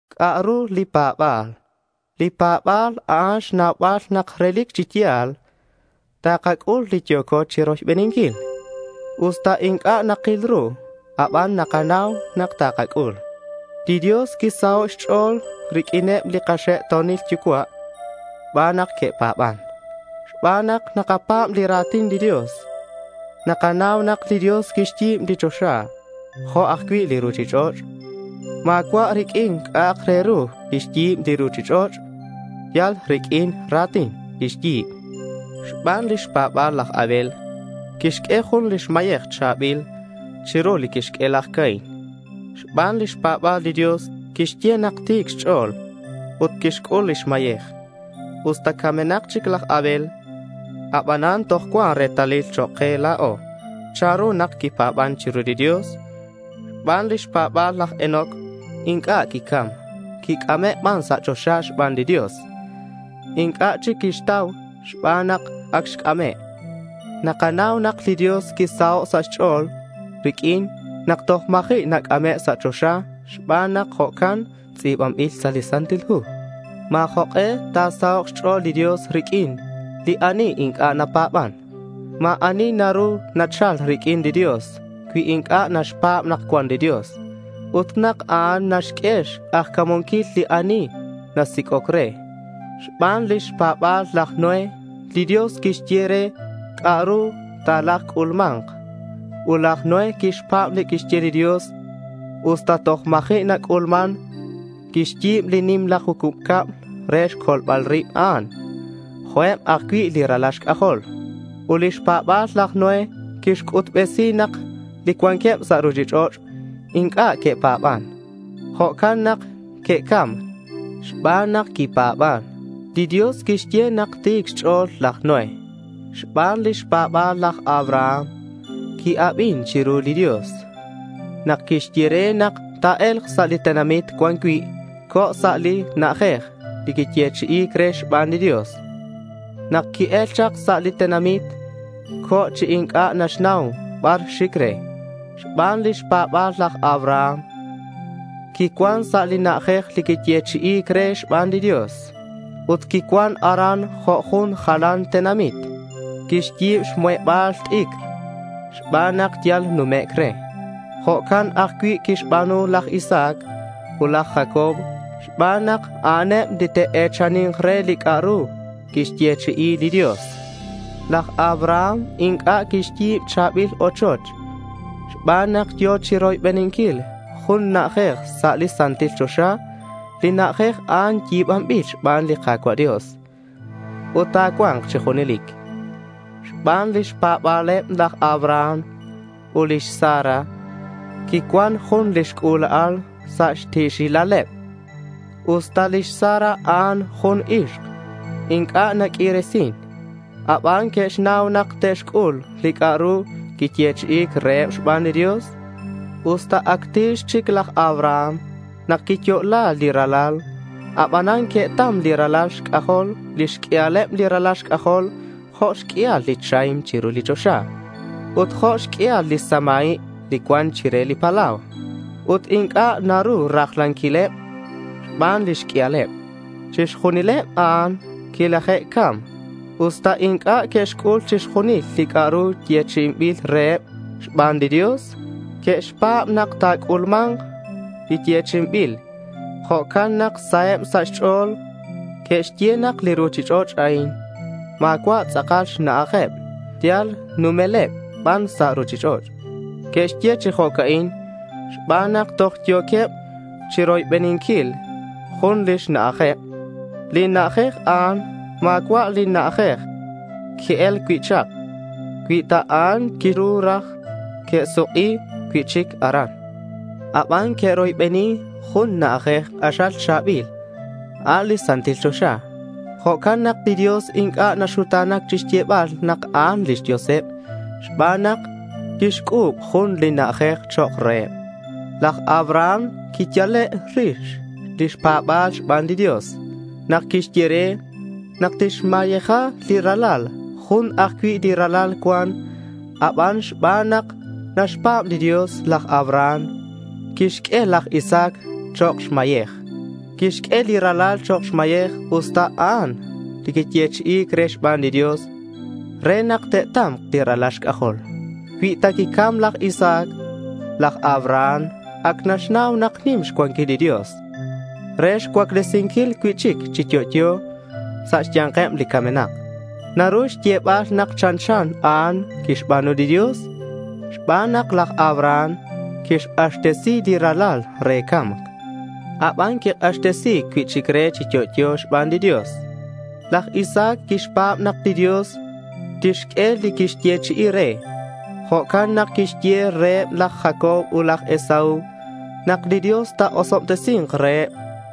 ¿C'a'ru li pa̱ba̱l? Li pa̱ba̱l a'an xnaubal nak relic chi ya̱l takac'ul li yo̱co chiroybeninquil. Usta inc'a' nakil ru aban nakanau nak takac'ul. Li Dios quisaho' xch'o̱l riq'uineb li kaxe'to̱nil yucua' xban nak que'pa̱ban. Xban nak nakapa̱b li ra̱tin li Dios, nakanau nak li Dios quixyi̱b li choxa jo' ajcui' li ruchich'och'. Ma̱cua' riq'uin c'a'ak re ru quixyi̱b li ruchich'och'. Yal riq'uin li ra̱tin quixyi̱b. Xban lix pa̱ba̱l laj Abel, quixq'ue jun xmayej cha̱bil chiru li quixq'ue laj Caín. Xban lix pa̱ba̱l, li Dios quixye nak ti̱c xch'o̱l ut quixc'ul lix mayej. Usta camenak chic laj Abel, aban toj cuan retalil chok' ke la̱o chanru nak quipa̱ban chiru li Dios. Xban lix pa̱ba̱l laj Enoc inc'a' quicam. Quic'ame' ban sa' choxa xban li Dios. Inc'a' chic que'xtau xban nak ac xc'ame'. Nakanau nak li Dios quisaho' sa' xch'o̱l riq'uin nak toj ma̱ji' nac'ame' sa' choxa xban nak jo'can tz'i̱banbil sa' li Santil Hu. Ma̱ jok'e ta̱sahok' xch'o̱l li Dios riq'uin li ani inc'a' napa̱ban. Ma̱ ani naru nachal riq'uin li Dios cui inc'a' naxpa̱b nak cuan li Dios ut nak a'an naxq'ue xk'ajca̱munquil li ani nasic'oc re. Xban lix pa̱ba̱l laj Noé, li Dios quixye re c'a'ru talajc'ulma̱nk. Ut laj Noé quixpa̱b li quixye li Dios usta toj ma̱ji' nac'ulman. Quixyi̱b li nimla jucub cab re xcolbal rib a'an, jo' eb ajcui' li ralal xc'ajol. Ut lix pa̱ba̱l laj Noé quixc'utbesi nak li cuanqueb sa' ruchich'och' inc'a' que'pa̱ban. Jo'can nak que'cam. Xban nak quipa̱ban, li Dios quixye nak ti̱c xch'o̱l laj Noé. Xban lix pa̱ba̱l, laj Abraham qui-abin chiru li Dios nak quixye re nak ta̱e̱lk sa' li tenamit cuan cui'. Co̱ sa' li na'ajej li quiyechi'i̱c re xban li Dios. Nak qui-el chak sa' li tenamit, co̱ chi inc'a' naxnau bar xic re. Xban lix pa̱ba̱l laj Abraham quicuan sa' li na'ajej li quiyechi'i̱c re xban li Dios, ut quicuan aran jo' jun jalan xtenamit. Quixyi̱b xmuheba̱l t'icr xban nak yal numec' re. Jo'can ajcui' que'xba̱nu laj Isaac ut laj Jacob xban nak a'aneb li te'e̱chani̱nk re li c'a'ru quixyechi'i li Dios. Laj Abraham inc'a' quixyi̱b cha̱bil ochoch, xban nak yo̱ chiroybeninquil jun xna'aj sa' li santil choxa. Li na'ajej a'an yi̱banbil xban li Ka̱cua' Dios ut ta̱cua̱nk chi junelic. Xban lix pa̱ba̱leb, laj Abraham ut lix Sara quicuan jun lix c'ula'al sa' xti̱xilaleb, usta lix Sara a'an jun ixk inc'a' naq'uiresin. Aban que'xnau nak te'xc'ul li c'a'ru quiyechi'i̱c reheb xban li Dios. Usta ac ti̱x chic laj Abraham nak quiyo'la li ralal, abanan que'tam li ralal xc'ajol. Lix q'uialeb li ralal xc'ajol jo' xq'uial li chahim chiru li choxa ut jo' xq'uial li samaib li cuan chire li palau. Ut inc'a' naru rajlanquileb xban lix q'uialeb. Chixjunileb a'an quilaje'cam. Usta inc'a' que'xc'ul chixjunil li c'a'ru quiyechi'i̱c reheb xban li Dios, que'xpa̱b nak ta̱c'ulma̱nk li yechi'inbil. Jo'can nak saheb sa' xch'o̱l. Que'xye nak li ruchich'och' a'in ma̱cua' tz'akal xna'ajeb; yal numeleb ban sa' ruchich'och'. Que'xye chi jo'ca'in xban nak toj yo̱queb chiroybeninquil jun lix na'ajeb. Li na'ajej a'an ma̱cua' li na'ajej que'el cui' chak. Cui ta a'an, quiru raj que'suk'i cui'chic aran. Aban que'roybeni jun na'ajej k'axal cha̱bil, a' li santil choxa. Jo'can nak li Dios inc'a' naxuta̱nac chixyebal nak a'an lix Dioseb xban nak quixc'u̱b jun li na'ajej chok' reheb. Laj Abraham quiyale' lix pa̱ba̱l xban li Dios nak quixye re nak tixmayeja li ralal. Jun ajcui' li ralal cuan, aban xban nak naxpa̱b li Dios, laj Abraham quixq'ue laj Isaac chok' xmayej. Quixq'ue li ralal chok' xmayej, usta a'an li quiyechi'i̱c re xban li Dios re nak te'ta̱mk li ralal xc'ajol. Cui ta quicam laj Isaac, laj Abraham ac naxnau nak nim xcuanquil li Dios re xcuaclesinquil cui'chic chi yo'yo sa' xya̱nkeb li camenak. Naru xyebal nak chanchan a'an quixba̱nu li Dios xban nak laj Abraham quixk'axtesi li ralal re ca̱mc. Aban quik'axtesi̱c cui'chic re chi yo'yo xban li Dios. Laj Isaac quixpa̱b nak li Dios tixq'ue li quixyechi'i re. Jo'can nak quixye reheb laj Jacob ut laj Esaú nak li Dios ta̱osobtesi̱nk reheb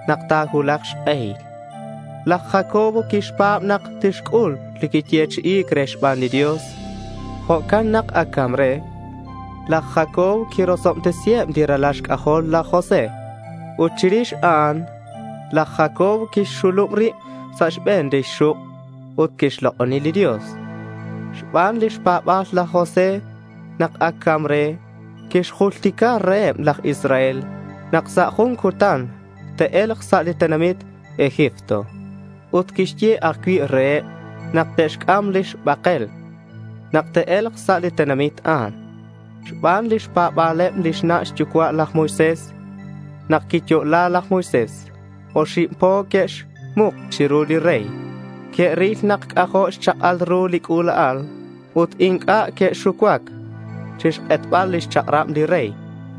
nak ta̱cuulak xk'ehil. Laj Jacob quixpa̱b nak tixc'ul li quiyechi'i̱c re xban li Dios. Jo'can nak ac ca̱mc re, laj Jacob quirosobtesiheb li ralal laj José. Ut chirix a'an, laj Jacob quixxulub rib sa' xbe̱n lix xuk' ut quixlok'oni li Dios. Xban lix pa̱ba̱l laj José, nak ac ca̱mc re, quixjultica reheb laj Israel nak sa' jun cutan te'e̱lk sa' li tenamit Egipto. Ut quixye ajcui' reheb nak te'xc'am lix bakel nak te'e̱lk sa' li tenamit a'an. Xban lix pa̱ba̱leb lix na' xyucua' laj Moisés, nak quiyo'la laj Moisés, oxib po que'xmuk chiru li rey. Que'ril nak c'ajo' xchak'al ru li c'ula'al ut inc'a' que'xucuac chi xk'etbal lix chak'rab li rey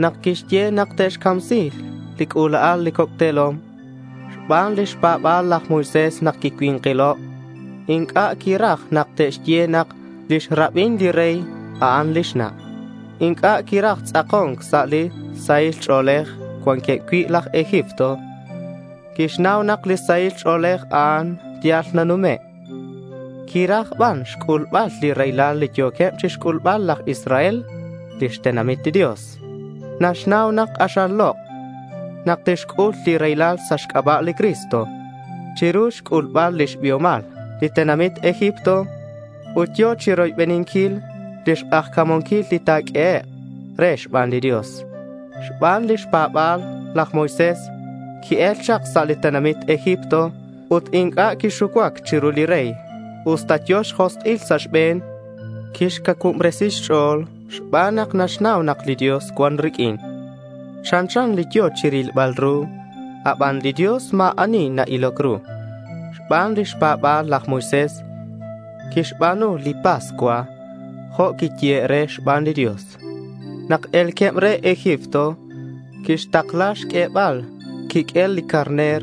nak quixye nak te'camsi̱k li c'ula'al li coc' te̱lom. Xban lix pa̱ba̱l laj Moisés, nak quicui̱nkilo' inc'a' quiraj nak te'xye nak lix rabin li rey, a'an lix na'. Inc'a' quiraj tz'ako̱nc sa' li sahil ch'o̱lej cuanqueb cui' laj Egipto. Quixnau nak li sahil ch'o̱lej a'an yal nanume'. Quiraj ban xc'ulbal li raylal li yo̱queb chixc'ulbal laj Israel lix tenamit li Dios. Naxnau nak k'axal lok' nak tixc'ul li raylal sa' xc'aba' li Cristo chiru xc'ulbal lix biomal li tenamit Egipto. Ut yo̱ chiroybeninquil lix k'ajca̱munquil li ta̱q'uehek' re xban li Dios. Xban xpa̱ba̱l laj Moisés qui-el chak sa' li tenamit Egipto ut inc'a' quixucuac chiru li rey usta yo̱ xjosk'il sa' xbe̱n. Quixcacuubresi xch'o̱l xban nak naxnau nak li Dios cuan riq'uin. Chanchan li yo̱ chirilbal ru, aban li Dios ma̱ ani na-iloc ru. Xban lix pa̱ba̱l, laj Moisés quixba̱nu li pascua jo' quiyehe' re xban li Dios. Nak e̱lqueb re Egipto quixtakla xq'uebal xquiq'uel li carner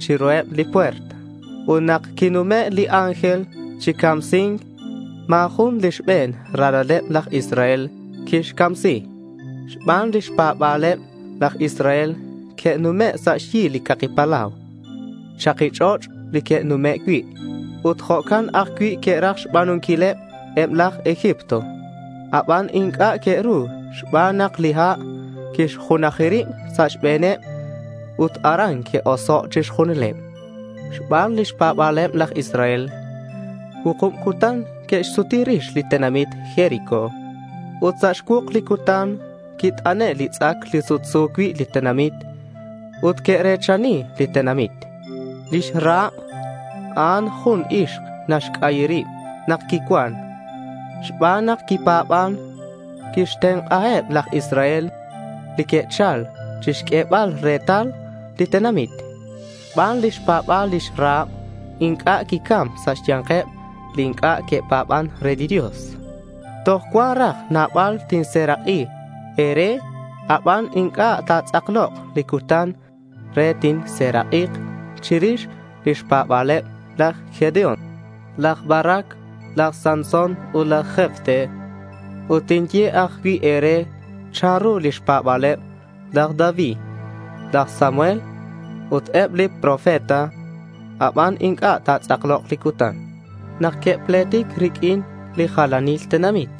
chiruheb li puerta. Ut nak quinume' li ángel chi camsi̱nc, ma̱ jun li xbe̱n ralaleb laj Israel quixcamsi. Xban lix pa̱ba̱leb laj Israel, que'nume' sa' xyi li caki palau. Chaki ch'och' li que'nume' cui'. Ut jo'can ajcui' que'raj xba̱nunquil eb laj Egipto. Aban inc'a' que'ru xban nak li ha' quixjunaji rib sa' xbe̱neb ut aran que'oso' chixjunileb. Xban lix pa̱ba̱leb laj Israel, cuukub cutan que'xsuti rix li tenamit Jericó. Ut sa' xcuuk li cutan quit'ane' li tz'ac li sutsu cui' li tenamit. Ut que're̱chani li tenamit. Lix Rahab a'an jun ixk naxc'ayi rib nak quicuan. Xban nak quipa̱ban, quixtenk'aheb laj Israel li que'chal chixq'uebal retal li tenamit. Xban lix pa̱ba̱l, lix Rahab inc'a' quicam sa' xya̱nkeb li inc'a' que'pa̱ban re li Dios. Toj cuan raj nabal tinserak'i e̱re, aban inc'a' ta̱tz'aklok li cutan re tinserak'ik chirix lix pa̱ba̱leb laj Gedeón, laj Barac, laj Sansón, ut laj Jefté; ut tinye ajcui' raj e̱re chanru lix pa̱ba̱leb laj David, laj Samuel, ut eb li profeta. Aban inc'a' ta̱tz'aklok li cutan. Nak que'pletic riq'uin li jalanil tenamit,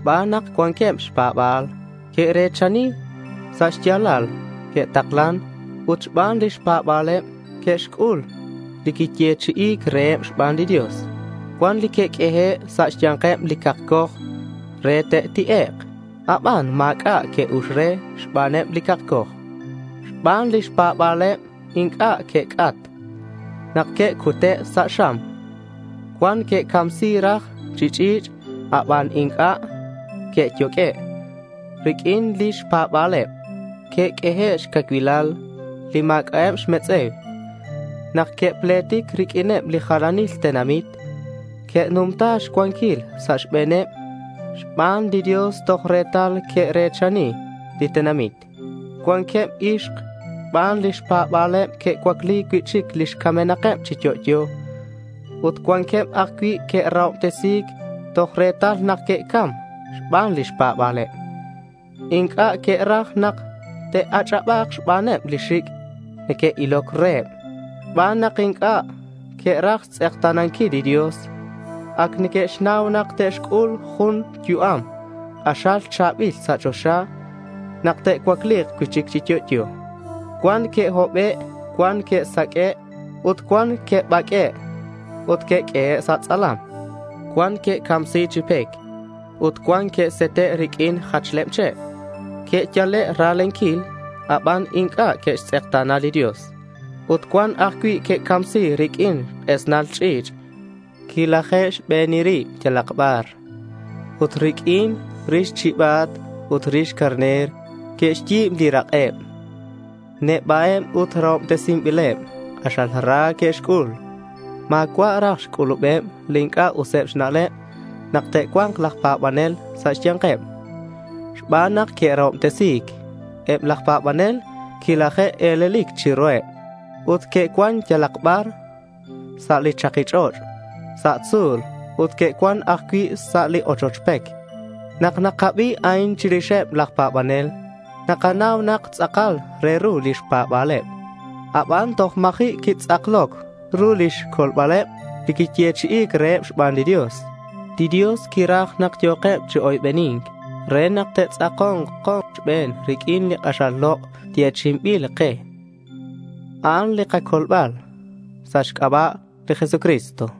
xban nak cuanqueb xpa̱bal, que're̱chani. Sa' xya̱lal que'taklan ut xban lix pa̱ba̱leb que'xc'ul li quiyechi'i̱c reheb xban li Dios. Cuan li que'q'uehe' sa' xya̱nkeb li cakcoj re te'ti'ek', aban ma̱c'a' que'ux re xbaneb li cakcoj. Xban lix pa̱ba̱leb inc'a' que'c'at nak que'cute' sa' xam. Cuan que'camsi̱c raj chi ch'i̱ch', aban inc'a' que'yoq'ue'. Riq'uin lix pa̱ba̱leb, que'q'uehe' xcacuilal li ma̱c'a'eb xmetz'e̱u. Nak que'pletic riq'uineb li jalanil tenamit, que'numta xcuanquil sa' xbe̱neb xban li Dios toj retal que're̱chani li tenamit. Cuanqueb ixk, xban lix pa̱ba̱leb, que'cuacli cui'chic lix camenakeb chi yo'yo. Ut cuanqueb ajcui' que'rahobtesi̱c toj retal nak que'cam xban lix pa̱ba̱leb. Inc'a' que'raj nak te'ach'aba̱k xbaneb li xic' neque'iloc reheb xban nak inc'a' que'raj xtz'ekta̱nanquil li Dios. Ac neque'xnau nak te'xc'ul jun yu'am k'axal cha̱bil sa' choxa nak te'cuacli̱k cui'chic chi yo'yo. Cuan que'hobe', cuan que'saq'ue', ut cuan que'baq'ue' ut que'q'uehe' sa' tz'alam. Cuan que'camsi̱c chi pec ut cuan que'sete' riq'uin jachleb che'. Que'yale' ra̱lenquil aban inc'a' que'xtz'ekta̱na li Dios. Ut cuan ajcui' que'camsi̱c riq'uin k'esnal ch'i̱ch'. Quilaje'xbeni rib yalak bar ut riq'uin rix chiba̱t ut rix carner que'xyi̱b li rak'eb. Neba'eb ut rahobtesinbileb. K'axal ra que'xc'ul. Ma̱cua' raj xc'ulubeb li inc'a' useb xna'leb nak te'cua̱nk laj pa̱banel sa' xya̱nkeb. Xban nak que'rahobtesi̱c, eb laj pa̱banel quilaje'e̱lelic chiruheb ut que'cuan yalak bar sa' li chaki ch'och', sa' tzu̱l, ut que'cuan ajcui' sa' li ochoch pec. Nak nakabi a'in chirixeb laj pa̱banel, nakanau nak tz'akal re ru lix pa̱ba̱leb. Aban toj ma̱ji' quitz'akloc ru lix colbaleb li quiyechi'i̱c reheb xban li Dios. Li Dios quiraj nak yo̱keb chi oybeni̱nc re nak te'tz'ako̱nk kochben riq'uin li k'axal lok' yechi'inbil ke. A'an li kacolbal sa' xc'aba' li Jesucristo.